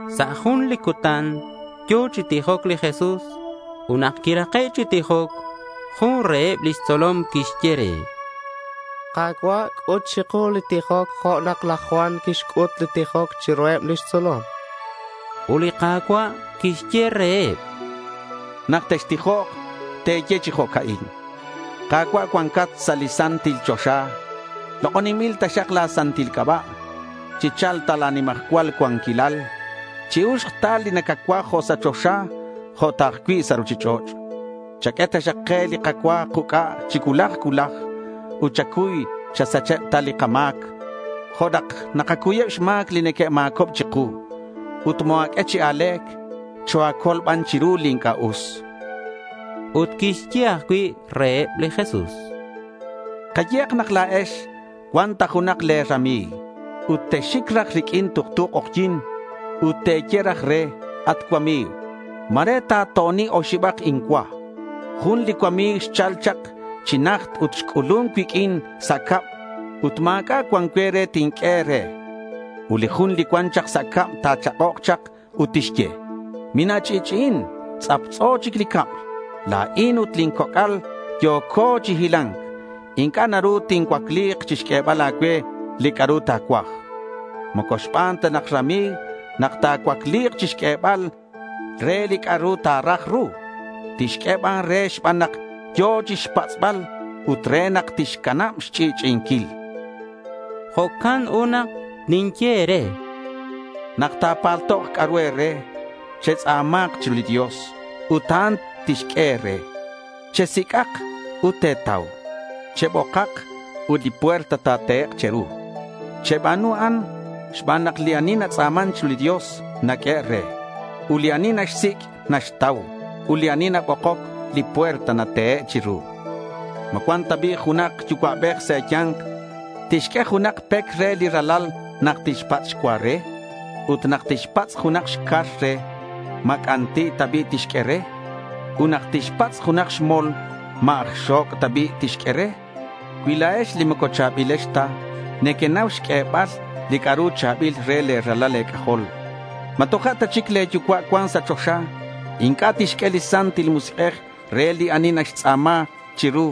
Sa' jun li cutan yo̱ chi tijoc li Jesús. Ut nak quirake' chi tijoc, jun reheb lix tzolom quixye re: —Ka̱cua', c'ut chiku li tijoc jo' nak laj Juan quixc'ut li tijoc chiruheb lix tzolom, chan. Ut li Ka̱cua' quixye reheb: —Nak textijok, te̱ye chi jo'ca'in: Ka̱cua', cuancat sa' li santil choxa, lok'oninbil taxak la̱ santil c'aba'. Chicha̱lk ta la̱ nimajcual cuanquilal. Chi-uxk ta li nacacuaj jo' sa' choxa, jo' ta ajcui' sa' ruchich'och'. Chaq'ue taxak ke li kacua kuc'a chi cuulaj cuulaj. Ut chacuy chasach ta li kama̱c jo' nak nakacuyeb xma̱c li neque'ma̱cob chiku. Ut moa̱q'ue chi a̱le̱c. Choa̱col ban chiru li inc'a' us. Ut quixye ajcui' reheb li Jesús: —Kayehak nak la̱ex cuan ta junak le̱ rami̱g. Ut texxic raj riq'uin tuktu k'ojyi̱n ut te̱ye raj re, “At cuami̱g, ma̱re ta̱to'oni oxibak incua. Jun li cuami̱g xchal chak chi najt ut xc'ulun cuiq'uin sa' cab. Ut ma̱c'a' cuan cue re tinq'ue re.” Ut li jun li cuan chak sa' cab ta̱chak'ok chak ut tixye, “Mina̱ch'i'ch'i'i. Tz'aptz'o chic li cab. La̱in ut eb lin coc'al yo̱co chi hila̱nc. Inc'a' naru nincuacli chixq'uebal a̱cue li c'a'ru ta̱cuaj.” Moco xban ta nak rami̱g nak ta̱cuacli̱k chixq'uebal re li c'a'ru ta̱raj ru. Tixq'ue ban re xban nak yo̱k chixpatz'bal ut re nak tixcanab xch'i'ch'i'inquil. Jo'can ut nak ninye e̱re: —Nak ta̱paltok c'a'ru e̱re, chextz'a̱ma̱nk chiru li Dios ut a'an tixq'ue e̱re. Chesic'ak ut te̱tau, chebokak ut li puerta ta̱tehek' che̱ru. Cheba̱nu a'an xban nak li ani natz'a̱man chiru li Dios naq'uehe' re. Ut li ani naxsic', naxtau. Ut li ani nabokoc, li puerta natehe' chiru. ¿Ma cuan ta bi' junak yucua'bej sa' e̱ya̱nk tixq'ue junak pec re li ralal nak tixpatz' xcua re? Ut nak tixpatz' junak xcar re, ¿ma c'anti' ta bi' tixq'ue re? Ut nak tixpatz' junak xmol, ¿ma aj xo̱c' ta bi' tixq'ue re? Cui la̱ex li moco cha̱bilex ta nequenau xq'uebal li c'a'ru cha̱bil re le̱ ralal e̱c'ajol, ¿ma toja' ta chic le̱ yucua' cuan sa' choxa inc'a' tixq'ue li Santil Musik'ej re li ani tixtz'a̱ma chiru?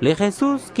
chan li Jesús reheb.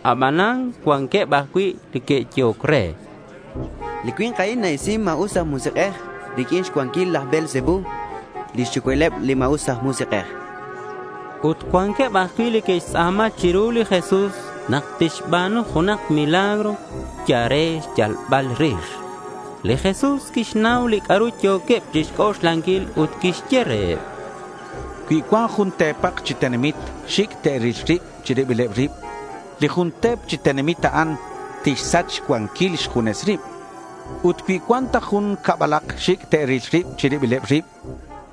Abanan cuanqueb ajcui' li que'yehoc re: —Li cui̱nk a'in na-isin ma̱us aj musik'ej riq'uin xcuanquil laj Beelzebú lix yucua'ileb li ma̱us aj musik'ej, chanqueb. Ut cuanqueb ajcui' li que'xtz'a̱ma chiru li Jesús nak tixba̱nu junak li milagro yal re xyalbal rix. Li Jesús quixnau li c'a'ru yo̱queb chixc'oxlanquil ut quixye reheb: —Cui cuan jun te̱pak chi tenamit xic' te'ril rib chi ribileb rib, li jun te̱p chi tenamit a'an tixsach xcuanquil xjunes rib. Ut cui cuan ta jun cabalak xic' te'ril rib chi ribileb rib,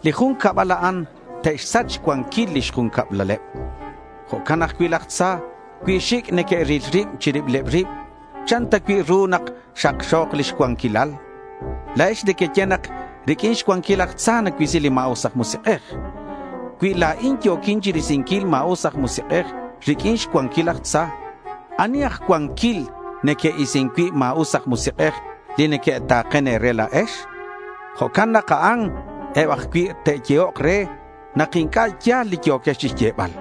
li jun cabal a'an te'xsach xcuanquil lix jun cablaleb. Jo'can ajcui' laj tza. Cui xic' neque'ril rib chi ribileb rib, ¿chan ta cui' ru nak xakxo̱k lix cuanquilal? La̱ex nequeye nak riq'uin xcuanquil laj tza nacuisi li ma̱us aj musik'ej. Cui la̱in yo̱quin chirisinquil ma̱us aj musik'ej riq'uin xcuanquil laj tza, ¿ani aj cuanquil neque'isin cui' ma̱us aj musik'ej li neque'ta̱ken e̱re la̱ex? Jo'can nak a'an eb ajcui' te'yehok re nak inc'a' ya̱l li yo̱quex chixyebal.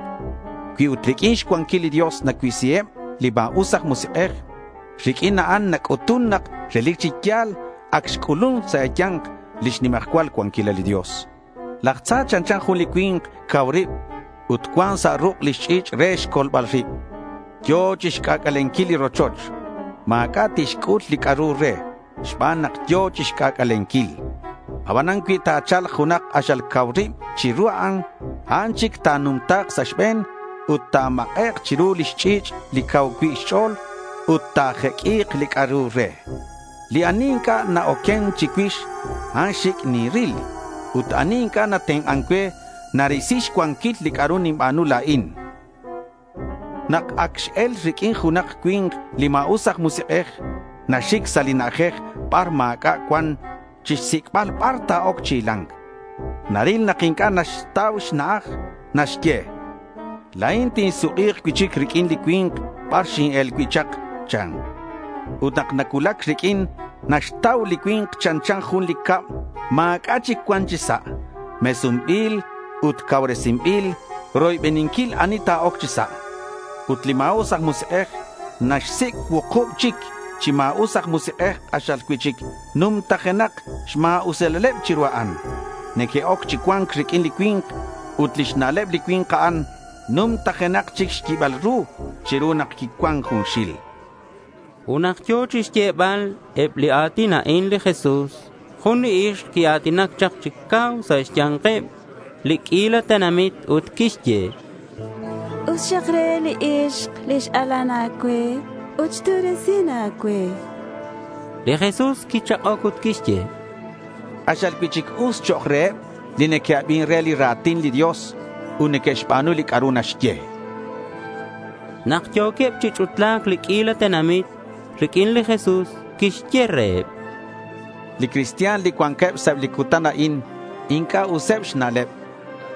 Cui ut riq'uin xcuanquil li Dios nacuisiheb li ma̱us aj musik'ej, riq'uin a'an nac'utun nak relic chi ya̱l ac xc'ulun sa' e̱ya̱nk lix nimajcual cuanquilal li Dios. Laj tza chanchan jun li cui̱nk cau rib ut cuan sa' ruk' lix ch'i̱ch' re xcolbal rib. Yo̱k chixc'ac'alenquil li rochoch. Ma̱c'a' tixc'ul li c'a'ru re xban nak yo̱k chixc'ac'alenquil. Abanan cui ta̱cha̱lk junak k'axal cau rib chiru a'an, a'an chic ta̱numta̱k sa' xbe̱n ut ta̱mak'ek' chiru lix ch'i̱ch' li cau cui' xch'o̱l ut ta̱jeq'ui̱k li c'a'ru re. Li ani inc'a' na-oquen chicuix, a'an xic' ninril. Ut ani inc'a' natenk'an cue, narisi xcuanquil li c'a'ru ninba̱nu la̱in, chan li Jesús. Nak ac x-el riq'uin junak cui̱nk, li ma̱us aj musik'ej naxic sa' li na'ajej bar ma̱c'a' cuan chixsic'bal bar ta̱oc chi hila̱nc. Naril nak inc'a' naxtau xna'aj. Naxye: —La̱in tinsuk'i̱k cui'chic riq'uin li cui̱nk bar xin-el cui' chak, chan. Ut nak nacuulac riq'uin naxtau li cui̱nk chanchan jun li cab ma̱c'a' chic cuan chi sa'. Mesunbil ut ac cauresinbil roybeninquil li ani ta̱oc chi sa'. Ut li ma̱us aj musik'ej naxsic' cuukub chic chi ma̱us aj musik'ej k'axal cui'chic numtajenak xma̱usilaleb chiru a'an. Neque'oc chi cua̱nc riq'uin li cui̱nk. Ut lix na'leb li cui̱nk a'an numtajenak chic xyibal ru chiru nak quicuan junxil. Ut nak yo̱ chixyebal eb li a̱tin a'in li Jesús, jun li ixk quia̱tinac chak chi cau sa' xya̱nkeb li q'uila tenamit, ut quixye: —Us xak re li ixk li x-alan a̱cue ut xtu'resin a̱cue, chan. Li Jesús quichak'oc ut quixye: —K'axal cui'chic us chok' reheb li neque'abin re li ra̱tin li Dios ut neque'xba̱nu li c'a'ru naxye. Nak yo̱queb chi ch'utla̱c li q'uila tenamit riq'uin, li Jesús quixye reheb: —Li cristian li cuanqueb sa' eb li cutan a'in inc'a' useb xna'leb.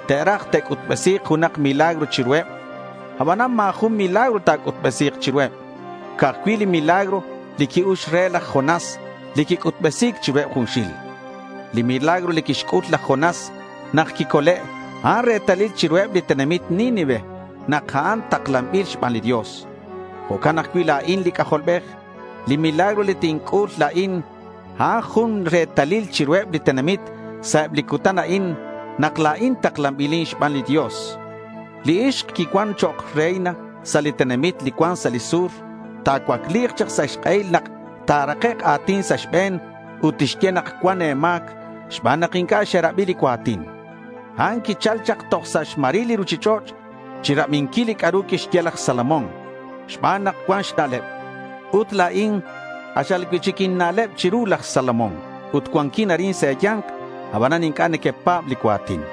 Te'raj ta̱c'utbesi̱k junak milagro chiruheb. Abanan ma̱ jun milagro ta̱c'utbesi̱k chiruheb. Ca'aj cui' li milagro li qui-ux re laj Jonás, li quic'utbesi̱c chiruheb junxil. Li milagro li quixc'ul laj Jonás nak quicole', a'an retalil chiruheb li tenamit Nínive nak a'an taklanbil xban li Dios. Jo'can ajcui' la̱in li C'ajolbej. Li milagro li tinc'ul la̱in, a'an jun retalil chiruheb li tenamit sa' eb li cutan a'in nak la̱in taklanbilin xban li Dios, chan. Li ixk li quicuan chok' reina sa' li tenamit li cuan sa' li sur, ta̱cuacli̱k chak sa' xk'ehil nak ta̱rakek' a̱tin sa' e̱be̱n ut tixye nak cuan e̱ma̱c xban nak inc'a' xerabi li cua̱tin. A'an quichal chak toj sa' xmaril li ruchich'och' chirabinquil li c'a'ru quixye laj Salomón xban nak cuan xna'leb. Ut la̱in k'axal cui'chic inna'leb chiru laj Salomón ut cuanquin arin sa' e̱ya̱nk. Abanan inc'a' nequepa̱b li cua̱tin.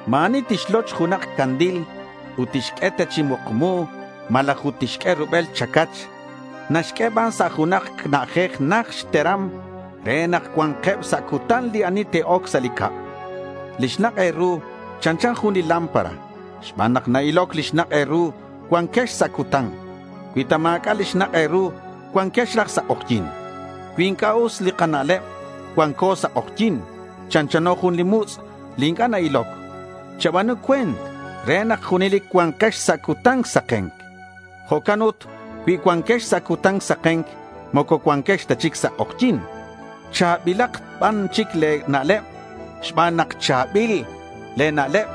Ma̱ ani tixloch junak candil ut tixq'ue ta chi mukmu malaj ut tixq'ue rubel chacach. Naxq'ue ban sa' junak na'ajej najt xteram re nak cua̱nkeb sa' cutan li ani te'oc sa' li cab. Li xnak' e̱ru chanchan jun li lámpara. Xban nak na-iloc li xnak' e̱ru cuanquex sa' cutan. Cui ta ma̱c'a' li xnak' e̱ru cuanquex raj sa' k'ojyi̱n. Cui inc'a' us li kana'leb, cuanco sa' k'ojyi̱n. Chanchano jun li mutz' li inc'a' na-iloc. Cheba̱nu cue̱nt re nak junelic cua̱nkex sa' cutan saken. Jo'can ut cui cuanquex sa' cutan saken, moco cuanquex ta chic sa' k'ojyi̱n. Cha̱bilak ban chic le̱ na'leb. Xban nak cha̱bil le̱ na'leb,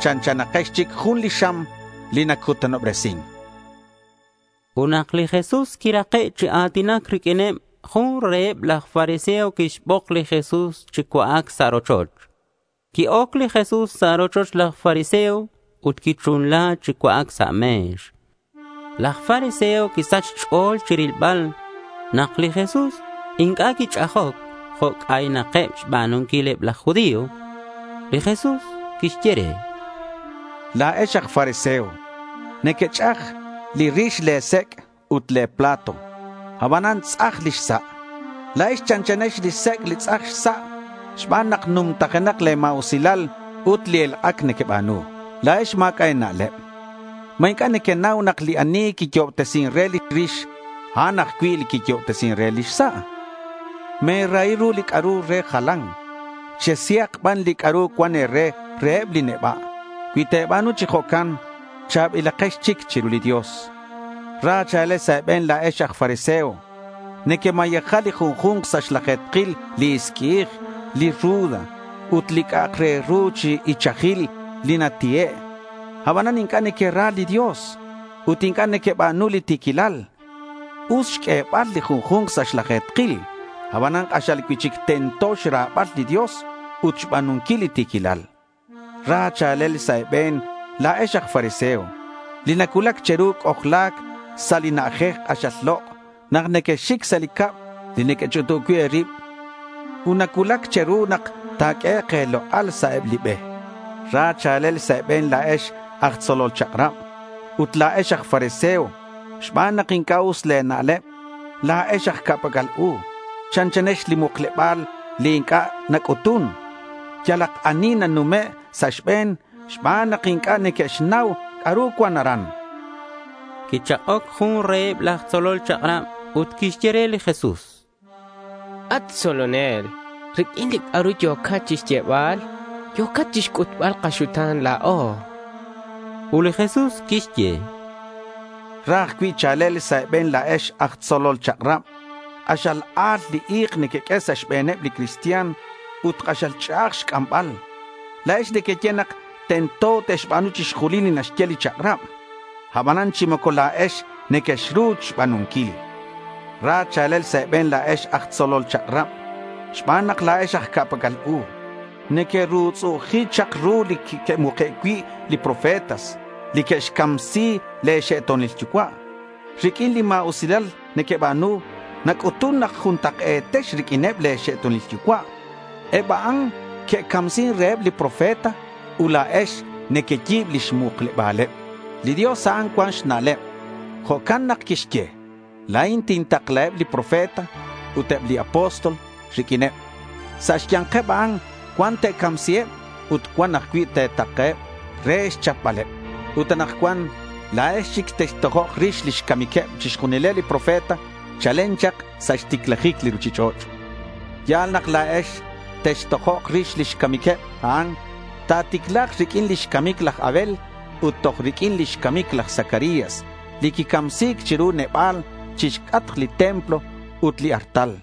chanchanakex chic jun li xam li nacutanobresin, chan. Ut nak li Jesús quirake' chi a̱tinac riq'uineb, jun reheb laj fariseo quixbok li Jesús chi cua'ac sa' rochoch. Qui-oc li Jesús sa' rochoch laj fariseo ut quichunla chi cua'ac sa' me̱x. Laj fariseo quisach xch'o̱l chirilbal nak li Jesús inc'a' quich'ajoc jo' c'aynakeb xba̱nunquil eb laj judío. Li Jesús quixye re: —La̱ex aj fariseo nequech'aj li rix le̱ sec' ut le̱ plato; abanan tz'aj lix sa'. La̱ex chanchanex li sec' li tz'aj xsa' xban nak numtajenak le̱ ma̱usilal ut li elk'ac nequeba̱nu. La̱ex ma̱c'a' e̱na'leb. ¿Ma inc'a' nequenau nak li ani quiyo'obtesin re li rix, a'an ajcui' li quiyo'obtesin re lix sa'? Me̱rahi ru li c'a'ru re jalan. Chesihak ban li c'a'ru cuan e̱re reheb li neba'. Cui te̱ba̱nu chi jo'can cha̱bilakex chic chiru li Dios, chan. Ra cha̱lel sa' e̱be̱n la̱ex aj fariseo. Nequemayeja li junju̱nk sa' xlaje̱tkil li isqui'ij, li ruda ut li c'a'ak re ru chi ichajil li nati'e'. Abanan inc'a' nequera li Dios ut inc'a' nequeba̱nu li ti̱quilal. Us xq'uebal li junju̱nk sa' xlaje̱tkil, abanan k'axal cui'chic tento xra̱bal li Dios ut xba̱nunquil li ti̱quilal. Ra cha̱lel sa' e̱be̱n la̱ex aj fariseo li nacuulac che̱ru c'ojla̱c sa' li na'ajej k'axal lok' nak nequexxic sa' li cab li nequech'utub cui' e̱rib. Ut nacuulac che̱ru nak ta̱q'uehek' e̱lok'al sa' eb li be. Ra cha̱lel sa' e̱be̱n la̱ex aj tzolol chak'rab ut la̱ex aj fariseo xban nak inc'a' us le̱ na'leb. La̱ex aj ca'pac'al u. Chanchanex li mukleba̱l li inc'a' nac'utun. Yalak ani nanume' sa' xbe̱n xban nak inc'a' neque'xnau c'a'ru cuan aran, chan. Quichak'oc jun reheb laj tzolol chak'rab ut quixye re li Jesús: —At tzolonel, riq'uin li c'a'ru yo̱cat chixyebal, yo̱cat chixc'utbal kaxuta̱n la̱o.— Ut li Jesús quixye: —Ra ajcui' cha̱lel sa' e̱be̱n la̱ex aj tzolol chak'rab. K'axal a̱l li i̱k nequeq'ue sa' xbe̱neb li cristian ut k'axal ch'a'aj xc'ambal. La̱ex nequeye nak tento te'xba̱nu chixjunil li naxye li chak'rab. Abanan chi moco la̱ex nequexru xba̱nunquil. Ra cha̱lel sa' e̱be̱n la̱ex aj tzolol chak'rab xban nak la̱ex aj ca'pac'al u. Nequerutz'u'uji chak ru li que'muke' cui' li profetas li que'xcamsi le̱ xe'to̱nil yucua'. Riq'uin li ma̱usilal nequeba̱nu nac'utun nak juntak'e̱tex riq'uineb le̱ xe'to̱nil yucua'. Eb a'an que'camsin reheb li profeta ut la̱ex nequeyi̱b lix mukleba̱leb. Li Dios, a'an cuan xna'leb. Jo'can nak quixye, “La̱in tintaklaheb li profeta ut eb li apóstol riq'uineb. Sa' xya̱nkeb a'an cuan te̱camsiheb, ut cuan ajcui' te̱ta̱keheb re xchapbaleb.” Ut anakcuan la̱ex chic textojok rix lix camiqueb chixjunileb li profeta chalen chak sa' xticlajic li ruchich'och'. Ya̱l nak la̱ex textojok rix lix camiqueb a'an. Ta̱ticla̱k riq'uin lix camic laj Abel ut toj riq'uin lix camic laj Zacarías li quicamsi̱c chiru neba̱l chixc'atk li templo ut li artal.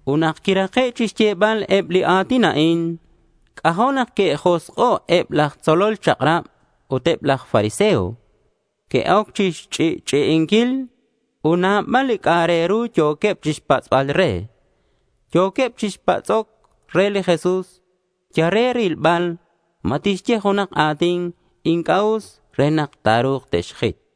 Ut nak quirake' chixyebal eb li a̱tin a'in, c'ajo' nak que'josk'o' eb laj tzolol chak'rab ut eb laj fariseo. Que'oc chixch'i'ch'i'inquil ut nabal li c'a'ak re ru yo̱queb chixpatz'bal re. Yo̱queb chi patz'oc re li Jesús yal re rilbal ma tixye junak a̱tin inc'a' us re nak ta̱ru̱k te'xjit.